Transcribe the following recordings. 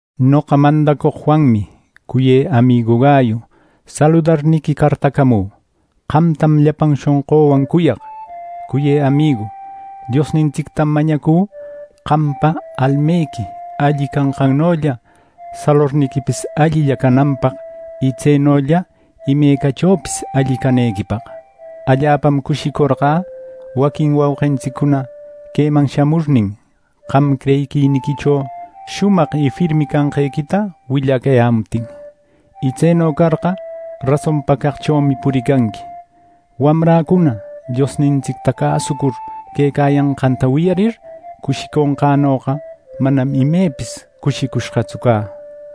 Noqa mandacoq Juanmi, cuyë amigu Gayu, saludarniqui cartacamü. Qamtam llapan shonqüwan cuyaq. Cuyë amigu, Diosnintsictam mañacü qampa almequi alli canqannolla salorniquipis allilla cananpaq, y tsenolla imecachopis alli canequipaq. Allapam cushicorqä waquin wauqintsiccuna queman shamurnin, qam creyiquiniquicho shumaq y firmi canqequita willacayämuptin; y tseno carqa, rasonpa caqchomi puricanqui. Wamräcuna Diosnintsicta cäsucur quecayanqanta wiyarir, cushiconqänoqa manam imepis cushicushqatsu cä.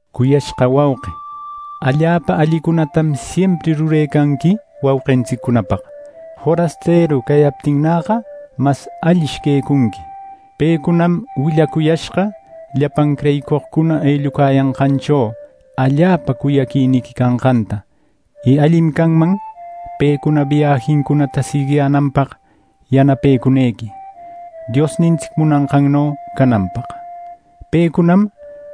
Cuyashqa wauqi, allapa allicunatam siempri rurecanqui wauqintsiccunapaq. Forasteru cayaptinnäqa, mas allish quecunqui. Pecunam willacuyashqa llapan creyicoqcuna ellucayashqancho allapa cuyaquiniqui canqanta. Y allim canman pecuna biajincunata siguiyänanpaq yanapecunequi, Diosnintsic munanqanno cananpaq. Pecunam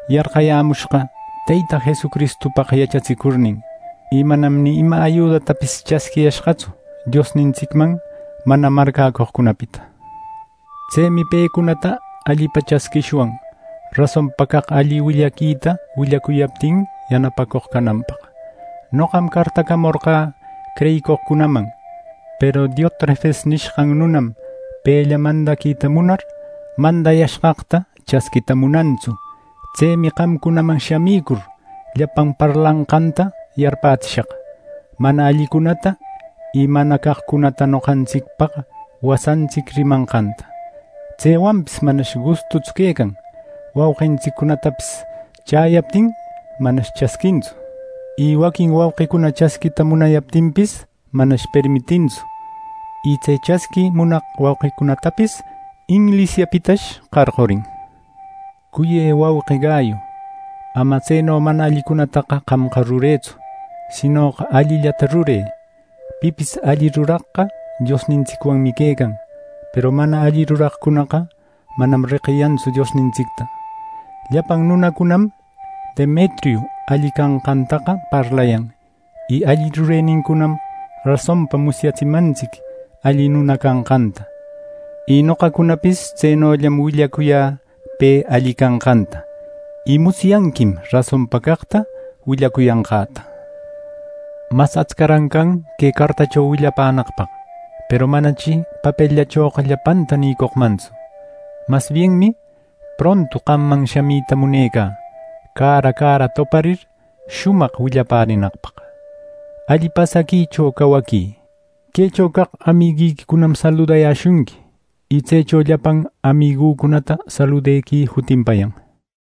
yarqayämushqa Teyta Jesucristupaq yachatsicurnin. Y manam ni ima ayudatapis chasquiyashqatsu Diosnintsicman mana marcäcoqcunapita. Tsemi pecunata allipa chasquishwan rasonpa caq alli willaquita willacuyaptin yanapacoq canapaq. Noqam cartacamorqä creyicoqcunaman; peru Diotrefes nishqan nunam, pella mandaquita munar, mandayashqaqta chasquita munantsu. Tsemi qamcunaman shamicur, llapan parlanqanta yarpätsishaq mana allicunata, y mana caqcunata noqantsicpaq wasantsic rimanqanta. Tsewanpis manash gustutsu quecan; wauqintsiccunatapis chäyaptin, manash chasquintsu. Y waquin wauqicuna chasquita munayaptinpis, manash permitintsu. Y tse chasqui munaq wauqicunatapis inglisiapitash qarqurin. Cuyë wauqï Gayu, ama tseno mana allicunataqa qamqa rurëtsu; sinoqa allillata rurë. Pipis alli ruraqqa Diosnintsicwanmi quecan; peru mana alli ruraqcunaqa manam reqiyantsu Diosnintsicta. Llapan nunacunam Demetriu alli canqantaqa parlayan. Y alli rurenincunam rasonpa musyatsimantsic alli nuna canqanta. Y noqacunapis tsenollam willacuyä pe alli canqanta. Y musyanquim rasonpa caqta willacuyanqäta. Mas atscaran can que cartacho willapänaqpaq, peru manachi papelllachoqa llapanta nïcoqmantsu. Mas bienmi prontu qamman shamita munecä, cara cara toparir, shumaq willapärinaqpaq. Alli pasaquicho cawaquï. Quecho caq amiguiquicunam saludayäshunqui. Y tsecho llapan amigucunata saludequï jutinpayan.